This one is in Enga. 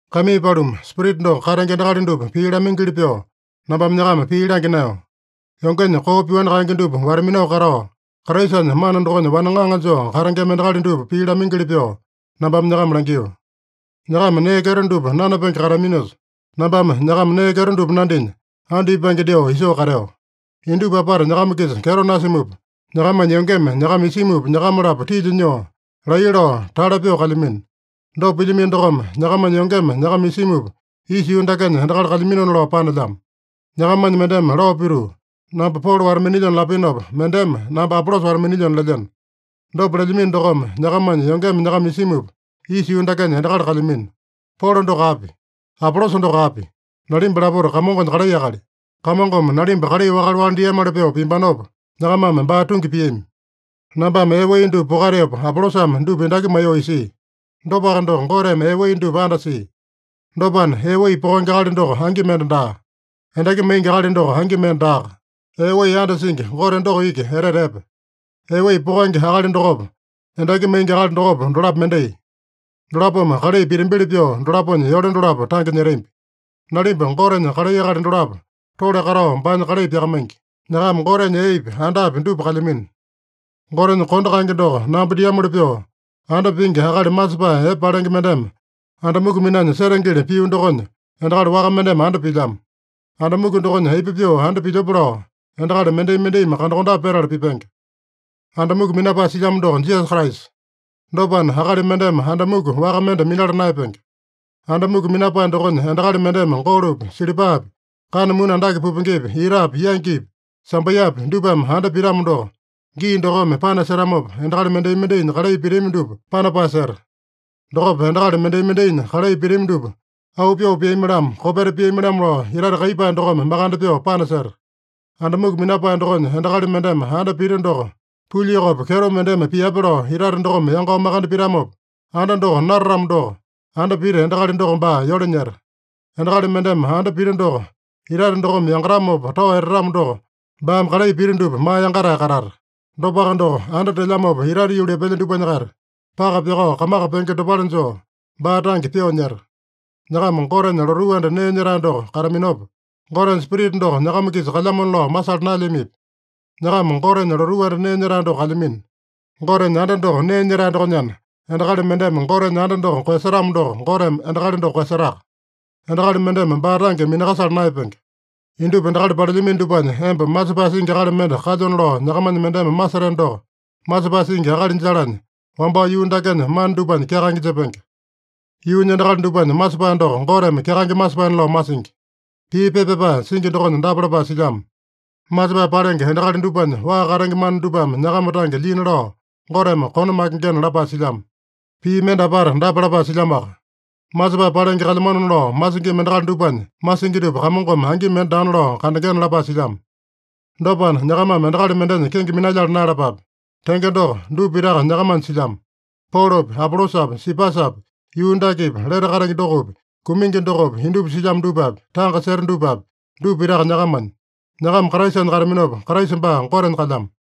Kaimii paluma, Spirita doko katenge endakali dupa pii lamaingili pyoo, nambame nyakama pii langya naeyo. Yongenya koo pyoani kaenge dupa wata-minao katao, Kraisanya mana dokonya wane ŋaŋa joo katengema endakali dupa pii lamaingili pyoo, nambame nyakama langio. Nyakama nee kyeto dupa nanapenge kateaminosa, nambame nyakama nee kyeto dupa nandinya, andu ipange dyoo isoo kateo. Indupa apata nyakama-kisa kyeto nasimupa, nyakamanya yongeme nyakama isimupa, nyakama-lapo tilya nyoo, laiya lao, tale pyoo kalyamino. Dopa pilyamino dokome, nyakamanya yongeme nyakama isimupa, isa yuu dakenya endakali kalyaminona lao panelyamo. Nyakamanya mendeme lao pituu, “Namba Polo wata-minilyona” lapinopa, mendeme, “Namba Apolosa wata-minilyona” lelyeno. Dopa lelyamino dokome, nyakamanya yongeme nyakama isimupa, isa yuu dakenya endakali kalyamino. Polo doko api? Apolosa doko api? Nalimba lapota Kamongonya kalai akali. Kamongome nalimba kalai wakale-wakale diamoli pyoo piambanopa, nyakamame baa tungi piami. Nambame ee wai dupa pokateopa, Apolosame dupa endaki maiyoo isia. Dopaka doko, Goteme ee wai dupa andasia. Dopana, ee wai pokenge akali doko angi mende daa. Endaki maingi akali doko angi mende daaka. Ee wai andasingi Gote doko iki etete epe. Ee wai pokenge akali dokopa, endaki maingi akali dokopa, dolapo mendai. Dolapome kalai pitambili pyoo dolaponya yole dolapo tange nyetambi. Nalimba Gotenya kalai akali dolapo tole katao baanya kalai pyakamaingi. Nyakama Gotenya eepi, andapi dupa kalyamino. Gotenya kondo kaenge doko namba diamoli pyoo, anda pingi akali masepae epe palenge mendeme anda muku minanya setengeli pio dokonya, endakali waka mendeme anda pilyamo. Anda muku dokonya aipa pyoo anda pilyope lao, endakali mendai-mendaimi kandakondape petala pipenge. Anda muku minapae silyamo doko Jisasa Kraisa. Dopana, akali mendeme anda muku waka mende minala naeyapenge. Anda muku minapae dokonya endakali mendeme golopi, silipapi, kana muni andake pupengepi, itapi, yangipi, sambaiyapi dupame anda pitamo doko, gii dokome panasetamopa, endakali mendai-mendainya kalai pitami dupa panapae seta. Dokopa endakali mendai-mendainya kalai pitami dupa auu pyoo piami-lamo, kopeta piami-lamo lao, itate kaiyepae dokome makande pyoo panaseta. Anda muku minapae dokonya endakali mendeme anda pita doko pulyokopi kyeto mendeme piape lao itate dokome yangao makande pitamopa anda doko natatamo doko, anda pita endakali doko baa yole nyeta. Endakali mendeme anda pita doko itate dokome yangatamopa tao etatamo doko, baame kalai pita dupa maa yangatae katata. Dopaka doko, anda telyamopa itate yuli epelya dupanya-kaita, paka pyakao kamaka penge dopale joo, baa tange pyoo nyeta. Nyakama Gotenya lotuu anda nee nyetae doko kataminopa, Gotenya Spirita doko nyakama-kisa kalyamona lao masala naelyamipi? Nyakama Gotenya lotuu anda nee nyetae doko kalyamino. Gotenya anda doko nee nyetae dokonyana, endakali mendeme Gotenya anda doko koeyasetamo doko, Goteme endakali doko koeyasetaka. Endakali mendeme baa tange minakasala naeyapenge. Indupa endakali palelyamino dupanya emba masepae singi akali mende kalyona lao nyakamanya mendeme maseteno doko, masepae singi akali jalanya, wambao yuu dakenya mana dupanya kyakaenge jepenge. Yuunya endakali dupanya masepae doko Goteme kyakaenge masepaena lao masingi. Pii pepa pyapae singi dokonya dapa lapae silyamo: “Masepae palenge endakali dupanya waa katenge mana dupame nyakama tange lyina lao Goteme kone makengena” lapae silyamo. Pii mende apata dapa lapae silyamoaka: “Masepae palenge kalyamanona lao masingima endakali dupanya masingi dupa Kamongome angi mende daana lao kandengena” lapae silyamo. Dopana, nyakamame endakali mendenya kenge minalyala naeyalapape. Tenge doko, dupa pitaka nyakamanya silyamo. Polopi, Apolosapi, Sipasapi, yuu dakepi, lete katenge dokopi, kumingi dokopi, indupa silyamo dupapi, tanga seta dupapi, dupa pitaka nyakamanya. Nyakama Kraisanya kataminopa, Kraisa baa Gotenya kalyamo.